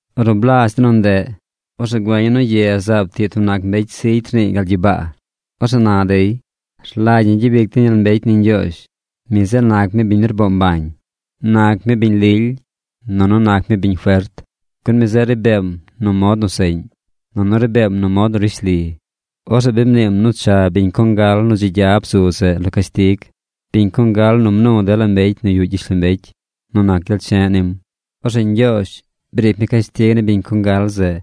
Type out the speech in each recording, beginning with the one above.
Ornu blazh de nu ndeꞌ, orzeꞌ güeña̱ nu ye zaab tiꞌ tub nac mbecy zigy rniiy gal gyibaa. Orzeꞌ na dey: ¡Rlagy ñi gyabic den gyel mbecy ni Ñgyoozh! Mi zeꞌ nac mi biñ nu rboo mbañ. Nac mi biñ lily, nunu nac mi biñ fert, Gun mi zeꞌ ri beem nu mod nu seꞌñ, nunu ri beem nu mod nu rishli. Orzeꞌ bi mniim nu cha biñ congal nu dzi gya bzu zeꞌ lo cashtig, biñ congal nu mnu dela mbecy nu yuꞌ gyishlombecy nu nac gyel che̱ꞌ nim. Orzeꞌ Ñgyoozh briic mi cashtig ni biñ congal zeꞌ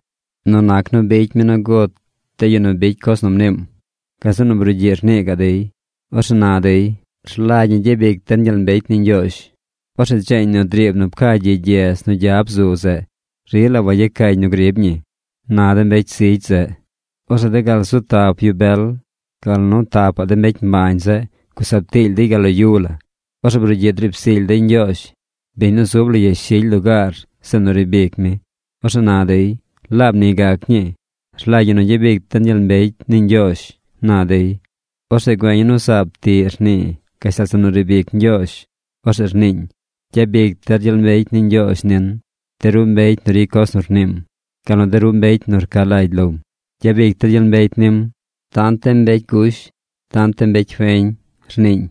nu nac nu bicy mi nu gut de yu nu ricy coz nu mniim. Gazeꞌ nu brugyiꞌ rnii gaꞌ dey. Orzeꞌ na dey: ―¡Rlagy ñi gyabic den gyel mbecy ni Ñgyoozh! Orzeꞌ dzeeñ nu driib nu pca gyi gyedz nu gya bzu zeꞌ rila wayecañ nu grib ñi ―na de mbecy zigy. Orzeꞌ de gal zu tap yu bel, gal nu tapaꞌ de mbecy mbañ zeꞌ gusab tiily dey gal lo yu la. Orzeꞌ brugyiꞌ driib zily dey Ñgyoozh, biñ nu zub lo yashily lugaar zeꞌ nu riib ic mi. Orzeꞌ na dey: ―¡Laab ni gac ñii! ¡Rlagy ñi nu gyabic den gyel mbecy ni Ñgyoozh! ―na dey. Orzeꞌ güeña̱ nu zaab tiꞌ rnii gashtal zeꞌ nu riib ic Ñgyoozh. Orzeꞌ rniiñ: Gyabic der gyel mbecy ni Ñgyoozh nin, de ru mbecy nu ricy coz nu rniim, gal nu de ru mbecy nu rca lagy lom. Gyabic der gyel mbecy nim, tant de mbecy gush tant de mbecy feñ, rniiñ.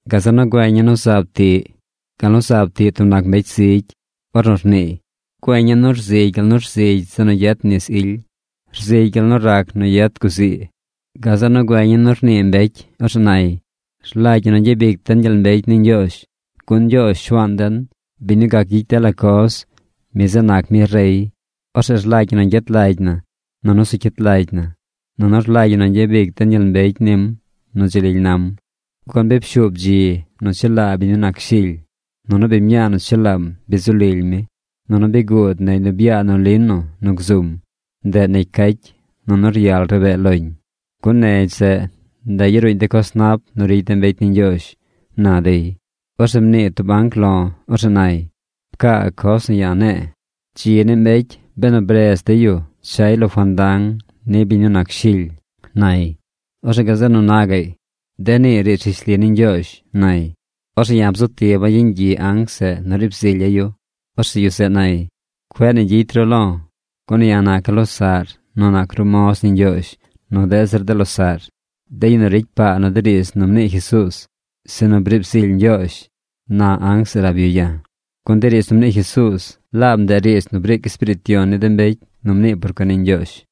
Gazeꞌ nu güeña̱ nu zaab tiꞌ gal nu zaab tiꞌ tub nac mbecy zigy ornu rniiy. Güeña̱ nu rzigy gal nu rzigy zeꞌ nu yet nis ily. Rzigy gal nu rac nu yet guzii. Gazeꞌ nu güeña̱ nu rnii mbecy. Orzeꞌ nay: Rlagy ñi nu gyabic den gyel mbecy ni Ñgyoozh. Gun Ñgyoozh Shuaan den, biñ nu gac gyicy dela coz, mi zeꞌ nac mi rey. Orzeꞌ rlagy ñi nu gyet lagy na nunu zu cyit lagy na. Nunu rlagy ñi nu gyabic den gyel mbecy nim nu dzi lily nam. Gun bi pshuub dzi nu chelaa biñ nu nac Shily. Nunu biñ mñaa nu chelaam bi zu lily mi. Nunu bi guud negy nu bya nu lino nu gzum. Ndeꞌ negy cacy, nunu ryal rabee loñ. Gun negy zeꞌ yaruuñ de coz nap nu ricy de mbecy ni Ñgyoozh, na dey. Orzeꞌ mnii tub anc lo̱. Orzeꞌ nay: ―Pcaa coz nu ya̱ ne̱e̱: “Dzi ni mbecy benu bredz dey yu chay lo fandang ni biñ nu nac Shily” ―nay. Orzeꞌ gazeꞌ nu na gaꞌy: ―De nii riidz rishli ni Ñgyoozh ―nay. Orzeꞌ ya̱ bzu tiba̱ yeñ gyiꞌ anc zeꞌ nu riib zilya̱ yu. Orzeꞌ yu zeꞌ nay: ―Cueꞌ ni gyicy ru lo̱. Gun ya̱ naca̱ losaꞌr nu nac ru moz ni Ñgyoozh nu deꞌ zir de losaꞌr, de yu nu ricy paa nu de riidz nu mnii Jesuuz, sinu briib zily Ñgyoozh ―na anc zeꞌ rab yu ya̱. Gun de riidz nu mnii Jesuuz, laab ndeꞌ riidz nu briic Espiriit Yon ni de mbecy nu mnii por cuen ni Ñgyoozh.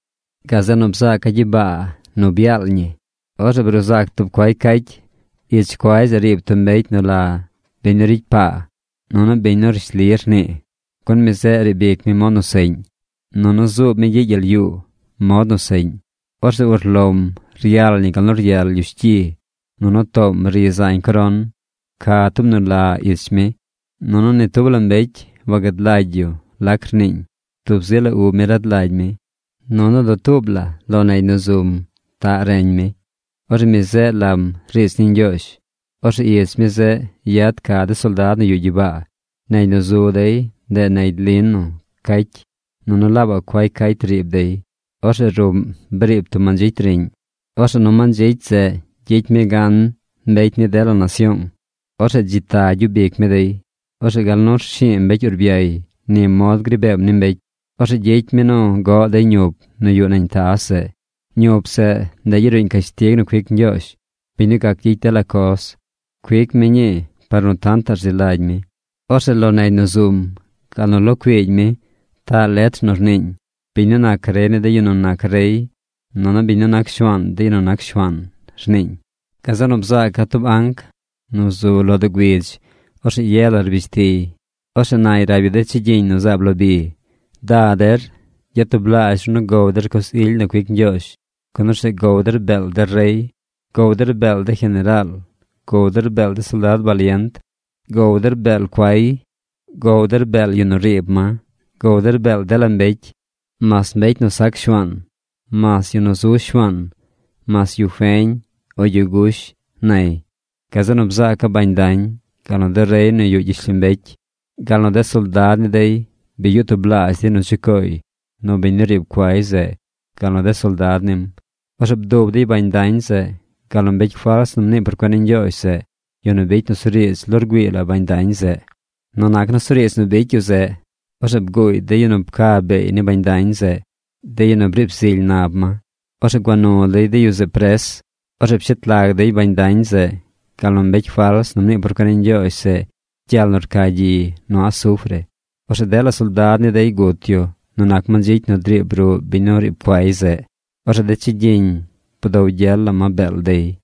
Gazeꞌ nu bzaaca̱ gyibaa nu byaal ñi. Orzeꞌ bruu zac tub cuay cacy. Ich cuay zeꞌ riib tub mbecy nu la Biñ nu Ricy Paa nunu Biñ nu Rishli Rnii. Gun mi zeꞌ riib ic mi mod nu seꞌñ. Nunu zuub mi gyiꞌ gyel yuu mod nu seꞌñ. Orzeꞌ urlom ryal ñi gal nu ryal lyush gyi. Nunu toom ri zañ coron. Ca tub nu la ich mi. Nunu ni tub la mbecy wagad lagy yu lac rniiñ. Tub zi la ub mi rad lagy mi. Nunu dutuub la negy nu zum taꞌ reñ mi. Orzeꞌ mi zeꞌ lam Riidz ni Ñgyoozh. Orzeꞌ ich mi zeꞌ yad ca de soldad nu yuꞌ gyibaa. Negy nu zu dey, ndeꞌ negy lino cacy. Nunu laabaꞌ cuay cacy riib dey. Orzeꞌ ruꞌm briib tub mandzicy riꞌñ. Orzeꞌ nu mandzicy zeꞌ gyicy mi gan mbecy ni dela nasyoong. Orzeꞌ dzi ta gyub ic mi dey. Orzeꞌ gal nu rshi̱i̱ mbecy urbyay, ni mod gri beem ni mbecy. Orzeꞌ gyicy mi nu goꞌ dey ñup nu yuꞌ nañ taz zeꞌ. Ñup zeꞌ, ndeꞌ yaruuñ cashtig nu cuic Ñgyoozh, biñ nu gac gyicy dela coz. Cuic mi ñii par nu tantaꞌ rzi lagy mi. Orzeꞌ lo negy nu zum gal nu lo cuiigy mi taꞌ letr nu rniiñ: “Biñ nu nac rey ni de yu nu nac rey nunu biñ nu nac Shuaan de yu nu nac shuaan”, rniiñ. Gazeꞌ nu bzaaca̱ tub anc nu zu lo doo güidz. Orzeꞌ ye la rbish tiy. Orzeꞌ nay rab yu de chigyiñ nu zaab lo bi: ―¡Da der, gyatublaazh ru nu gow der coz ily nu cuic Ñgyoozh, gun orzeꞌ gow der beel de rey, gow der beel de jeneraal, gow der beel de soldad balient, gow der beel cuay, gow der beel yu nu riib ma, gow der beel dela mbecy, mas mbecy nu sac shuaan, mas yu nu zu shuaan, mas yu feñ o yu gush! ―nay. Gazeꞌ nu bzaaca̱ bañ dañ, gal nu de rey nu yuꞌ gyishlombecy, gal nu de soldad ni dey bi yuꞌ tublaazh dey nu chucooy nu biñ nu riib cuay zeꞌ gal nu de soldad nim. Orzeꞌ bdub dey bañ dañ zeꞌ, gal nu mbecy fals nu mnii por cuen ni Ñgyoozh zeꞌ, yu nu bicy nusuriidz lo rgüii la bañ dañ zeꞌ. Nu nac nusuriidz nu bicy yu zeꞌ, orzeꞌ bguuy de yu nu pca beey ni bañ dañ zeꞌ, de yu nu briib zily nab ma. Orzeꞌ gua nu dey de yu zeꞌ pres. Orzeꞌ pshet lag dey bañ dañ zeꞌ, gal nu mbecy fals nu mnii por cuen ni Ñgyoozh zeꞌ gyel nu rca gyi nu asufre. Orzeꞌ dela soldad ni dey gut yu nu nac mandzicy nu driib ruꞌ biñ nu riib cuay zeꞌ. Orzeꞌ de chigyiñ bdow gyel la ma beel dey.